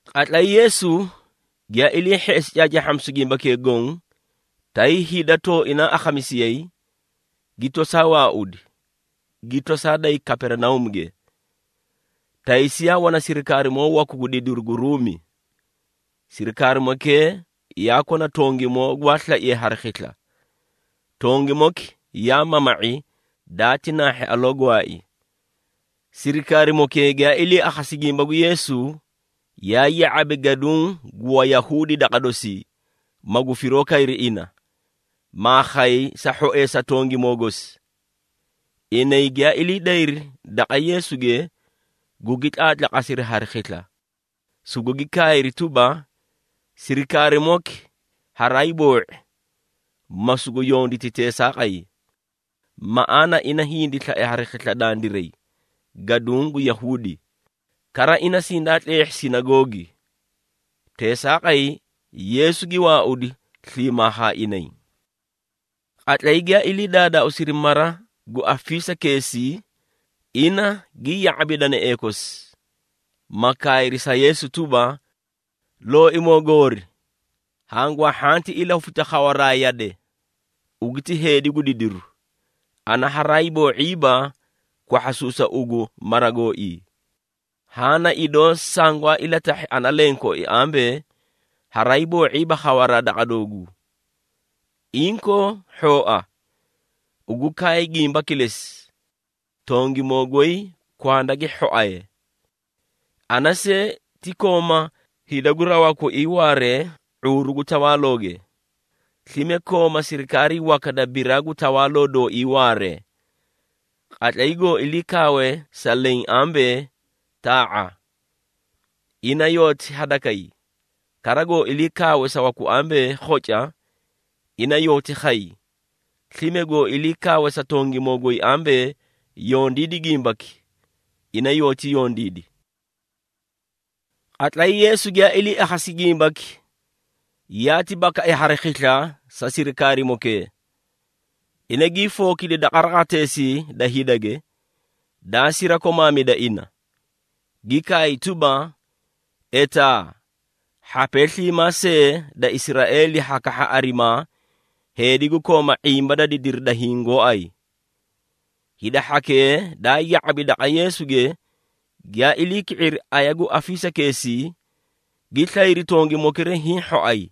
Qatlay Yeesu giyaa ilii hheꞌesi caacaahhamisu gimbakee goõ, tay hida tooinaa akhamisiyayi, gi tosaa waaudi, gi tosaa day Kaperinauumuge. Taysi yaa wana sirikaarimoo waku gu didiru gu Ruumi. Sirikaarimokee yaa kona tongimoo gwaa slaiye hari khisla. Tongimoki yaa mama⁄i daati naahhi aloo gwaai. Sirikaarimokee giyaa ilii akhasi gimba gu Yeesu, yaa ya⁄abi gaduũ gu Wayahuudi daqa dosii, magu firoo kayri ina, maa khay sa hhoeesi tongimoo gosi. Inay giyaa ilii dayri daqa Yeesuge, gugi tlaatlaqasiri hari khisla, sugugi kaayri tuba, “Sirikaarimoki haraay boo⁄i, ma sugu yonditi teesaaqay. Maꞌaana ina hindi slai hari khisla dandiray gaduũ gu Yahuudi, kara ina sindaa tleehhi sinagoogi.” Teesaaqay Yeesu gi waaudi sliimaa haa inay. Qatlay giyaa ilii daadaauusi mara gu afisakeesii, ina gi ya⁄abi danaee kosi, ma kaayri sa Yeesu tuba, “Looimoo goori, hangwaa hhanti ilahufita khawaraa yade, ugu ti heedi gu didiru, ana haraa hiiboo⁄iiba kwahhasuusa ugu mara gooii. Haã na idoo sangwaa ilatahhi ana lenkooi ambee, haraa hiiboo⁄iiba khawaraa daqa dooguu. Inkoo, hhooa, ugu kaay gimba kilesi, tongimoo goy kwanda gi hhoaye! Ana see, ti kooma hida gu rawaa koii waaree ⁄uuru gu tawaalooge. Slime kooma sirikaarii waka da biraa gu tawaaloo dooii waaree. Qatlay goó ilii kaawe sa leẽ ambee, ‘Taa⁄a!’ Ina yoóti hadakay. Kara goó ilii kaawe sa waku ambee, ‘Khoca!’ ina yoóti khay. Slime goó ilii kaawe sa tongimoo goy ambee, ‘Yondiidi gimbaki!’ Ina yoóti yondiidi.” Qatlay Yeesu giyaa ilii akhasi gimbaki, yaati bakai hari khisla sa sirikaarimokee. Ina gii fookidi daqa raqateesii da hidage, daa sirakomaamida ina, gi kaay tuba, “Etaa, hhapee sliimaa see da Israeeli ha kahha arimaa heedi gu kooma ⁄imba da didiri da hiĩ gooay!” Hida hhakee daa ya⁄abi daqa Yeesuge giyaa ilii ki⁄iri aya gu afisakeesii, gi slayri tongimokira hiĩ hhoay.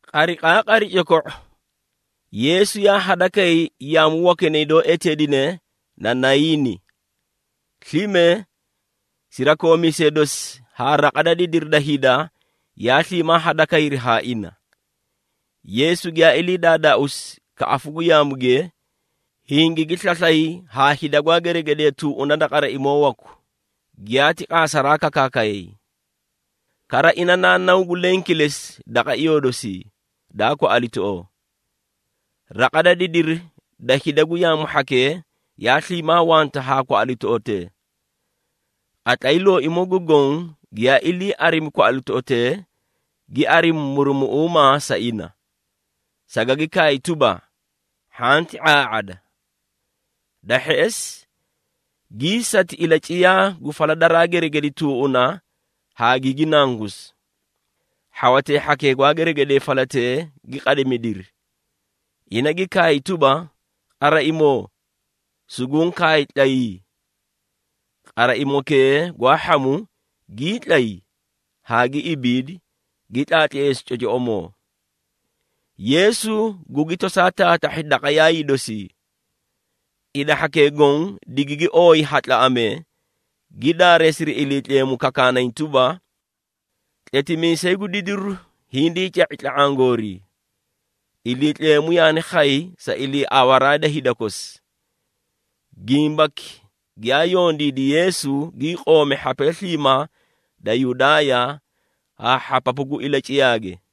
Qariqaaqari coko⁄o, Yeesu yaa hadakay yaamu wakinay doó eteedine na Nayiini. Slime, sirakoomiisee dosi haa raqa da didiri da hida yaa sliimaa hadakayri haa ina. Yeesu giyaa ilii daadaauusi kaꞌafu gu yaamuge, hingigi slaslay haa hida gwaa geregedee tuuna da qaraimoo waku, giyaati qaasaraa kakaakay. Kara ina naa naw gu leẽ kilesi daqa iyoo dosii, daa kwaꞌalitoꞌoo. Raqa da didiri da hida gu yaamu hhakee yaa sliimaa wanta haa kwaꞌalitoꞌotee. Qatlay Looimoo gu Goõ giyaa ilii arimi kwaꞌalitoꞌotee, gi arimi murumuꞌuuma sa ina, sagagi kaay tuba, “Hhanti ⁄aa⁄ada!” Da hheꞌesi, gii sati ilaciyaa gu fala daraa geregedi tuuꞌuna haa gigi nangusi. Hhawatee hhakee gwaa geregedee falatee gi qadimidiri. Ina gi kaay tuba, “Qaraimoo, suguũ kaay, tlayii!” Qaraimokee gwaa hhamu, gii tlay haa gi ibiidi, gi tlaatleesi cocoꞌomoo! Yeesu gugi tosaa taatahhi daqa yaayii dosii. Hida hhakee goõ digigi ooyi ha tlaꞌamee, gi daareesiri Iliitleemu, kakaanay tuba, “Tletimiisay gu didiru hindii ca⁄i tla⁄aã goorii. Iliitleemu yaani khay sa iliiawaraa da hida kosi!” Gimbaki giyaa yondiidi Yeesu gii qoomi hhapee sliimaa da Yudaaya haa hhapapu gu ilaciyaage.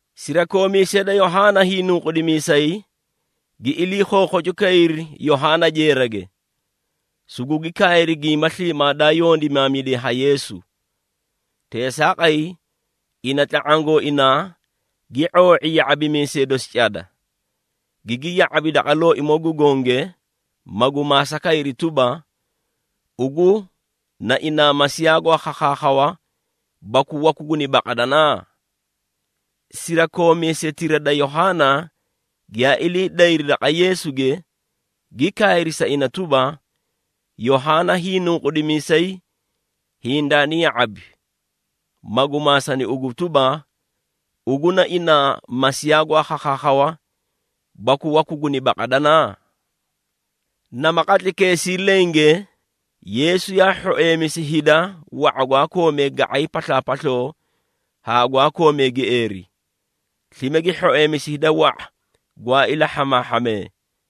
Sirakoomiisee da Yohaana Hiinunqudimiisay gi ilii khookhocu kayri Yohaana jeerage, sugugi kaayri gimba sliimaa daa yondimaamidiye ha Yeesu. Teesaaqay ina tla⁄aã gooinaa gi ⁄oo⁄i ya⁄abimiisee dosi cada, gigi ya⁄abi daqa Looimoo gu Gonge, magu maasa kayri tuba, “Ugu na inaa Masiiya gwaa khakhaakhawa baku waku guni baqadana?” Sirakoomiisetira da Yohaana giyaa ilii dayri daqa Yeesuge, gi kaayri sa ina tuba, “Yohaana Hiinunqudimiisay hindaani ya⁄abi, magu maasani ugu tuba, ‘Ugu na inaa Masiiya gwaa khakhaakhawa baku waku guni baqadana?’” Nama qatlaykeesii lenge, Yeesu yaa hhoeemisi hida wa⁄a gwaa koomee ga⁄ay paslaapasloo haa gwaa koomee gieeri, slime gi hhoeemisi hida wa⁄a gwaa ilahhamaahhamee,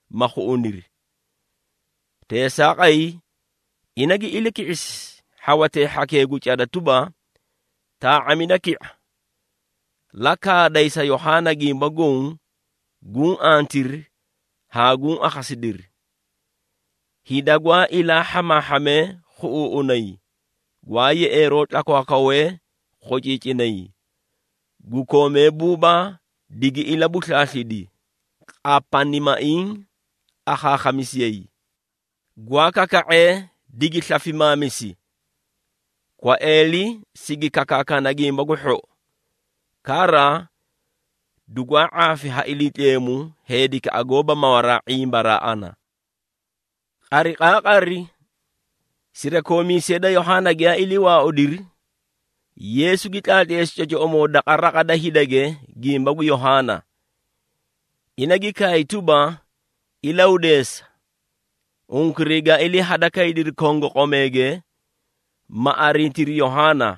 ma khuꞌuniri. Teesaaqay, ina gi ilaki⁄isi hhawatee hhakee gu cada tuba, “Taa⁄amida ki⁄a, la kaaday sa Yohaana gimba goõ guũ antiri haa guũ akhasidiri. Hida gwaa ilaa hhamaahhamee khuꞌuuꞌunay, gwaa yeꞌeeroo tlakwaakwawee khociicinay, gu koomee buubaa digi ilabuslaaslidi, qapanimaiĩ akhaakhamisiyayi, gwaa kaka⁄ee digi slafimaamisi, kwaeeli sigi kakaakana Gimba gu Hhou. Kara dugwaa ⁄aafi ha Iliitleemu heedikaꞌa goóba mawaraa ⁄imbaraa ana.” Qariqaaqari sirakoomiisee da Yohaana giyaa ilii waaudiri, Yeesu gi tlaatleesi cocoꞌomoo daqa raqa da hidage gimba gu Yohaana. Ina gi kaay tuba, “Ilahudeesa, unkuray gaa ilii hada kaydiri kongoqomeege, ma arintiri Yohaana,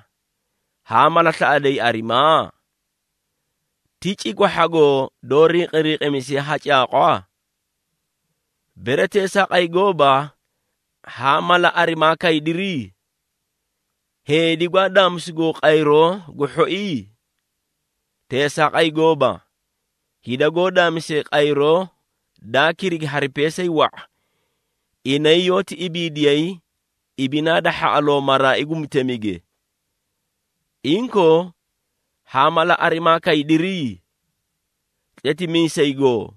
haa mala slaꞌaday arimaa? Ti cikwahhagoo doó rinqirinqimisiye ha caaqwa? Bere teesaaqay gooba, haã mala arimaa kaydiri? Heedi gwaa daamisugoo qayroo gu hhoii? Teesaaqay gooba, hida goó daamisee qayroo daa kirigi hari peesay wa⁄a, inay yoóti ibiidiyay ibinaa da hhaꞌaloo maraai gu mutemige! Inkoo, haã mala arimaa kaydiri? Tletimiisay goo?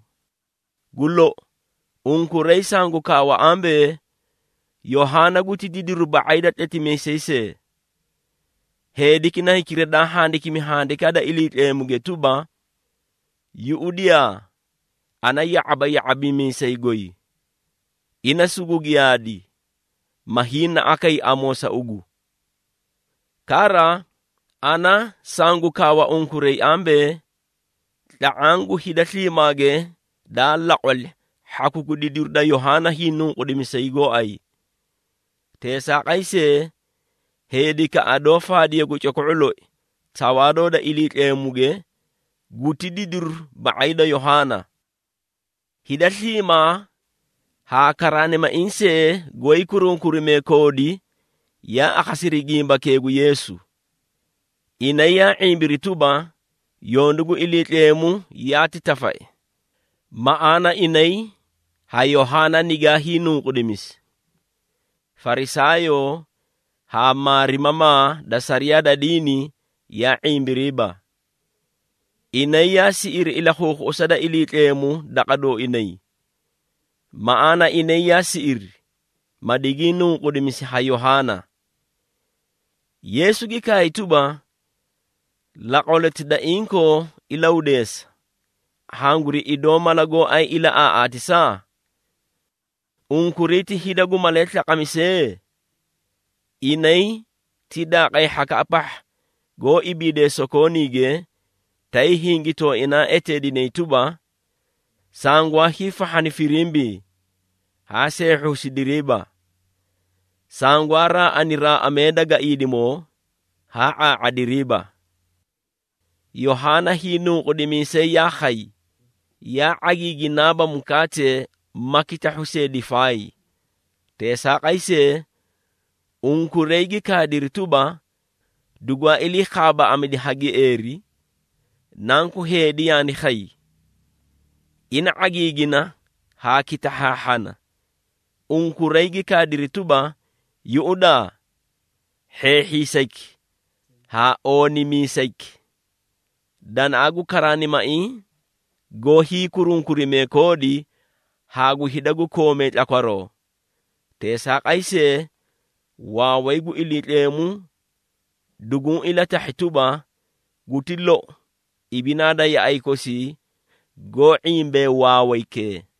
Gu lou! Unkuray sangu kaawa ambee, Yohaana guti didiru ba⁄ay da tletimiisay see. Heediki na hikira daa handikimi Handikaa da Iliitleemuge tuba, ‘Yuꞌudiyaa, ana ya⁄aba ya⁄abimiisay goy, ina sugu giyaadi, ma hiinaꞌa kay amoo sa ugu.’ Kara, ana sangu kaawa unkuray ambee, ‘Tla⁄aã gu hida sliimaage daa laqwali hhaku gu didiru da Yohaana Hiinunqudimiisay gooay. Teesaaqay see, heedikaꞌa doó faadiye gu coko⁄o loi Tawaaloo da Iliitleemuge guti didiru ba⁄ay da Yohaana.’” (Hida sliimaa haa karaanimaiĩ see goóyii kurunkurimee koodi yaa akhasiri gimbakee gu Yeesu. Inay yaa ⁄imbiri tuba, yondu gu Iliitleemu yaati tafai, maꞌaana inay ha Yohaana nigaa hiinunqudimisi. Farisaayoo haa maarimamaa da sariyaa da diini yaa ⁄imbiriiba. Inay yaa siꞌiri ilakhuukhuꞌusa da Iliitleemu daqa dooinay, maꞌaana inay yaa siꞌiri, ma digii nunqudimisi ha Yohaana.) Yeesu gi kaay tuba, “Laqwaloti da inkoo ilahudeesa, hanguri idoo mala gooay ilaꞌaaꞌaatisa? Unkuray ti hida gu malee slaqamisee? Inay ti daaqay hhakaꞌa pahha goó ibiidee sokooniige, tay hingi tooinaa eteedinay tuba, ‘Sangwaa hiifahhani firimbii, haa seehhusidiriiba! Sangwaa raaꞌani raaꞌamee da gaiidimoo, haa ⁄aa⁄adiriiba!’ Yohaana Hiinunqudimiisay yaa khay, yaa ⁄agiiginaaba mukaate ma kitahhu see difaay. Teesaaqay see, unkuray gi kaadiri tuba, ‘Dugwaa ilii khaabaaꞌadi ha gieeri.’ Nanku Heedi yaani khay, ina ⁄agiigina haa kitahhaahhana, unkuray gi kaadiri tuba, ‘Yuꞌudaa, hheehhiisayki haa oonimiisayki, danaꞌa gu karaanimaiĩ goó hiikurunkurimee koodi haa gu hida gu koomee tlakwaroo!’ Teesaaqay see, waaway gu Iliitleemu duguũ ilatahhi tuba, guti lou ibinaa da yaꞌay kosii goó ⁄imbee waawaykee.”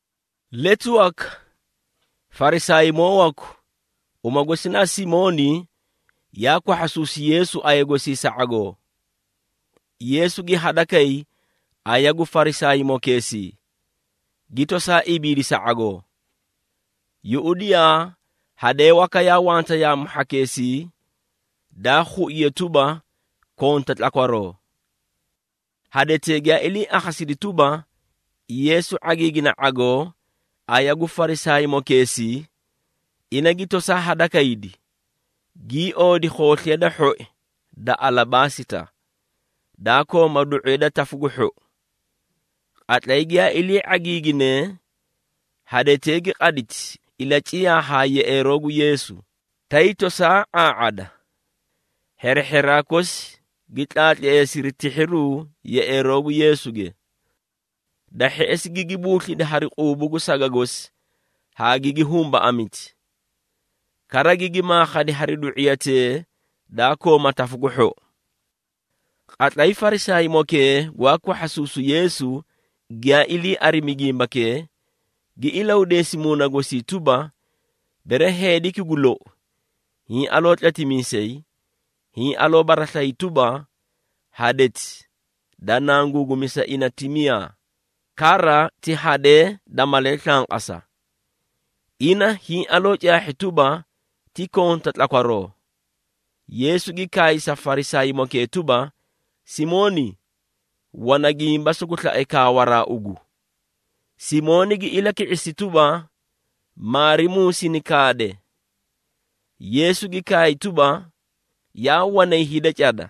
Letu waka Farisaaymoo waku, uma gosi na Simooni yaa kwahhasuusi Yeesu aya gosii sa ⁄agoo. Yeesu gi hadakay aya gu Farisaaymokeesii, gi tosaa ibiidi sa ⁄agoo. Yuꞌudiyaa, hadee waka yaa wanta yaamu hhakeesii, daa khuiye tuba, konta tlakwaroo. Hadetee giyaa ilii akhasidi tuba, Yeesu ⁄agiigina ⁄agoo aya gu Farisaaymokeesii, ina gi tosaa hadakaydi, gii oodi khoosliya da hhoi da alabaasita, daa kooma du⁄iya da tafu gu hhou. Qatlay giyaa ilii ⁄agiiginee, hadetee gi qaditi, ilaciyaa haa yeꞌeeroo gu Yeesu, tay tosaa ⁄aa⁄ada. Hherehheraa kosi gi tlaatleesiri tihhiruu yeꞌeeroo gu Yeesuge. Da hheꞌesi gigi buuslidi hari quubu gu saga gosi haa gigi humbaꞌamiti. Kara gigi maakhadi hari du⁄iyatee daa kooma tafu gu hhou. Qatlay Farisaaymokee gwaa kwahhasuusu Yeesu giyaa ilii arimi gimbakee, gi ilahudeesi muuna gosii tuba, “Bere heediki gu lou, hiĩ aloo tletimiisay, hiĩ aloo baraslayi tuba, hadeti da nanguugumisa ina ti miyaa, kara ti hadee da malee slanqasa. Ina hiĩ aloo caahhi tuba, ti konta tlakwaroo!” Yeesu gi kaay sa Farisaaymokee tuba, “Simooni, wana gimba sugu slae kaawaraa ugu.” Simooni gi ilaki⁄isi tuba, “Maarimuu sini kaade.” Yeesu gi kaay tuba, “Yaa wanay hida cada,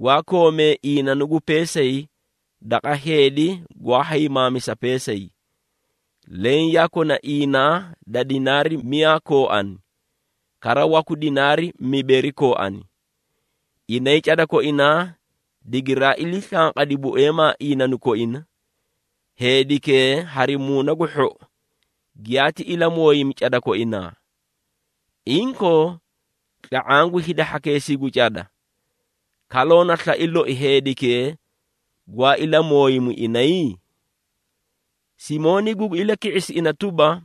gwaa koomee iinanu gu peesay daqa heedi gwaa haymaamisa peesay. Leẽ yaa kona iinaa da dinaari miyaa kooani, kara waku dinaari mibeeri kooani. Inay cada koinaa digiraa ilii slanqadi bueemaa iinanu koina, heedikee hari muuna gu hhou giyaati ilamooyimi cada koinaa. Inkoo, tla⁄aã gu hida hhakeesii gu cada, kaloo na slai loi heedikee gwaa ilamooyimu inay?” Simooni gugi ilaki⁄isi ina tuba,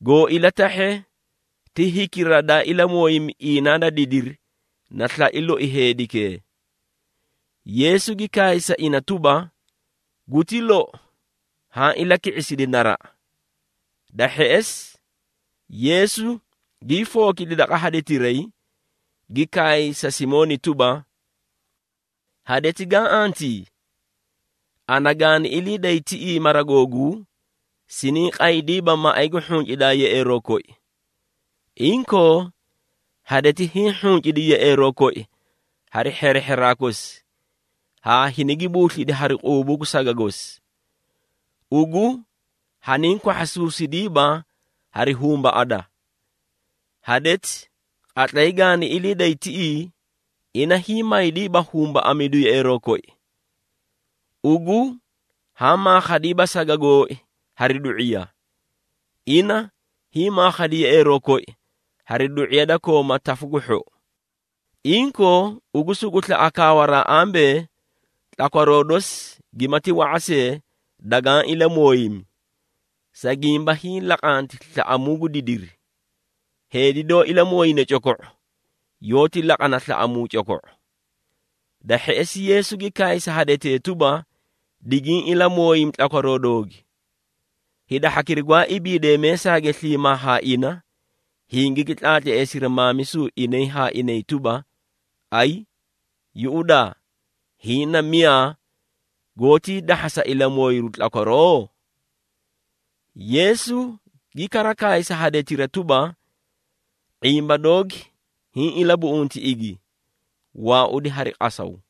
“Goo ilatahhe ti hikira daa ilamooyimi iinaa da didiri na slai loi heedikee.” Yeesu gi kaay sa ina tuba, “Guti lou, haã ilaki⁄isidi naraꞌa.” Da hheꞌesi Yeesu gii fookidi daqa hadetiray, gi kaay sa Simooni tuba, “Hadeti gaã antii? Ana gaani ilii day tiꞌii mara googuu, siniĩ qaydiiba maꞌay gu hhuncidaa yeꞌeeroo koi. Inkoo, hadeti hiĩ hhuncidi yeꞌeeroo koi hari hherehheraa kosi haa hinigi buuslidi hari quubu gu saga gosi. Ugu haniĩ kwahhasuusidiiba hari humbaꞌada. Hadeti qatlay gaani ilii day tiꞌii, ina hiĩ maydiiba humbaꞌamidu yeꞌeeroo koi. Ugu haã maakhadiiba saga gooi hari du⁄iya. Ina hiĩ maakhadi yeꞌeeroo koi hari du⁄iya da kooma tafu gu hhou. Inkoo, ugu sugu slaꞌa kaawaraa ambee, tlakwaroo dosi gimati wa⁄a see, dagaã ilamooyimi, sa gimba hiĩ laqanti slaꞌamuu gu didiri. Heedi doó ilamooyine coko⁄o, yoóti laqana slaꞌamuu coko⁄o.” Da hheꞌesi Yeesu gi kaay sa hadetee tuba, “Digiĩ ilamooyimi tlakwaroo doogi.” Hida hhakira gwaa ibiidee meesaage sliimaa haa ina, hingigi tlaatleesiri maamisu inay haa inay tuba, “Ayi! Yuꞌudaa, hiĩ na miyaa, goótii dahhasa ilamooyiru tlakwaroo?” Yeesu gi kara kaay sa hadetira tuba, “⁄imba doogi, hiĩ ilabuꞌunti igi, waaudi hari qasaw!”